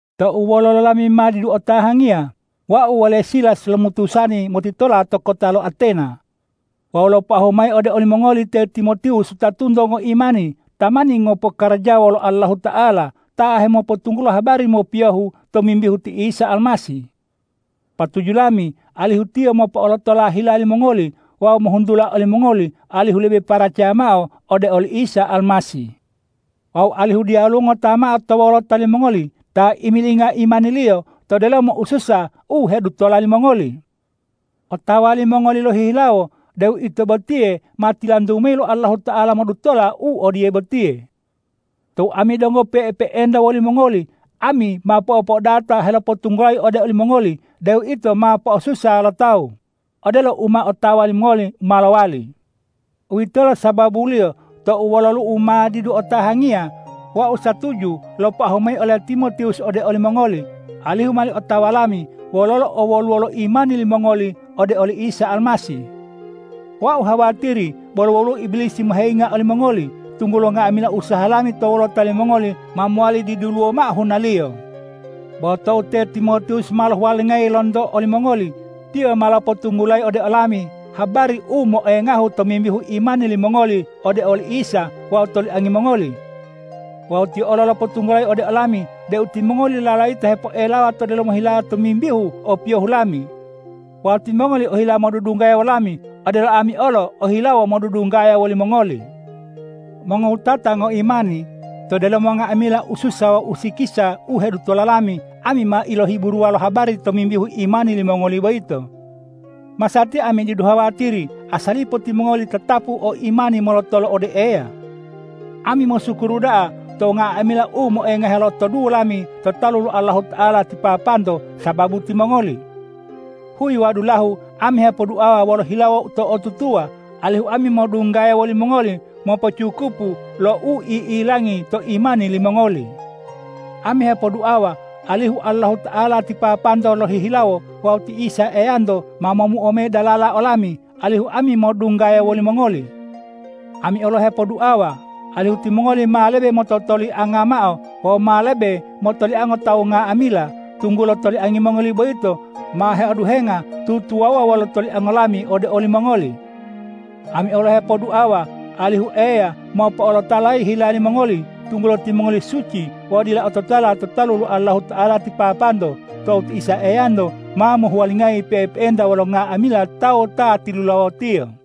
Tou wololo lami ma didu otahangiya, wau wole Silas lomutusani motitola to kota lo Atena wawu lopoahu mayi ode olimongoli te Timotiwus wutatunto ngoimani tamani ngopokarajawa wolo Allahuta'ala, ta hemopotunggulo habari mopiyohu tomimbihu ti Isa Almasih. Patuju lami alihu tiyo mopo'olotola hila limongoli wawu mohuntula olimongoli alihu lebe paracaya mao ode oli Isa Almasih wawu alihu diyaluwo ngota mao to wolota limongoli ta imilinga imaniliyo to delomo ususa u hedutola limongoli. Otawa limongoli lohihilawo deu ito botiye ma tilantu mayi lo Allahuta'ala modutola u odiye botiye. Tou ami donggo pe'epe'enta wolimongoli, ami ma po'opo'odata helopotunggulayi ode olimongoli deu ito ma po'osusa lo tawu, odelo u ma otawa limongoli ma lowali. Uwitolo sababuliyo tou wololu'u ma didu otahangiya, wau satuju lopoahu mayi ole Timotiwus ode olimongoli, alihu mowali otawa lami wololo owoluwo lo imani limongoli ode oli Isa Almasih. Wau hawatiri bolo woluwo Ibilisi moheyinga olimongoli, tunggulo nga'amila usaha lami to wolota limongoli ma mowali diduluwo mao hunaliyo. Bo tou te Timotiwus ma lohuwalingayi lonto olimongoli, tiyo ma lopotunggulayi ode olami habari u moengahu tomimbihu imani limongoli ode oli Isa wawu toliangi mongoli. Wawu tiyo olo lopotunggulayi ode olami deu timongoli lalayita hepoelawa to delomo hilawo tomimbihu opiyohu lami. Wawu timongoli ohila modudunggaya wolami, odelo ami olo ohilawo modudunggaya wolimongoli. Mongowutata ngoimani, to delomo nga'amila ususa wawu usikisa u hedutola lami, ami ma ilohiburuwa lo habari tomimbihu imani limongoli boyito. Masatiya ami didu hawatiri asalipo timongoli tatapu o imani molotolo ode Eya. Ami mosukuru da'a to nga'amila u moengahe lotoduwo lami to talu lo Allahuta'ala ti Papanto sababu timongoli. Huyi wawu dulahu ami hepoduawa wolo hilawo to'otutuwa, alihu ami modunggaya wolimongoli mopocukupu lo u i'ilangi to imani limongoli. Ami hepoduawa alihu Allahuta'ala ti Papanto lohihilawo wawu ti Isa Eyanto ma momuo mayi dalala olami, alihu ami modunggaya wolimongoli! Ami olo hepoduawa alihu timongoli ma lebe mototolianga mao wawu ma lebe motoliango tawu nga'amila, tunggulo toliangi mongoli boyito ma heoduhenga tutuwawuwa wolo toliango lami ode olimongoli. Ami olo hepoduawa alihu Eya mopo'olotolayi hila limongoli, tunggulo timongoli suci wawu dila ototala to talu lo Allahuta'ala ti Papanto tou ti Isa Eyanto ma mohuwalingayi pe'epe'enta wolo nga'amila tawu ta tilulawo-Tiyo.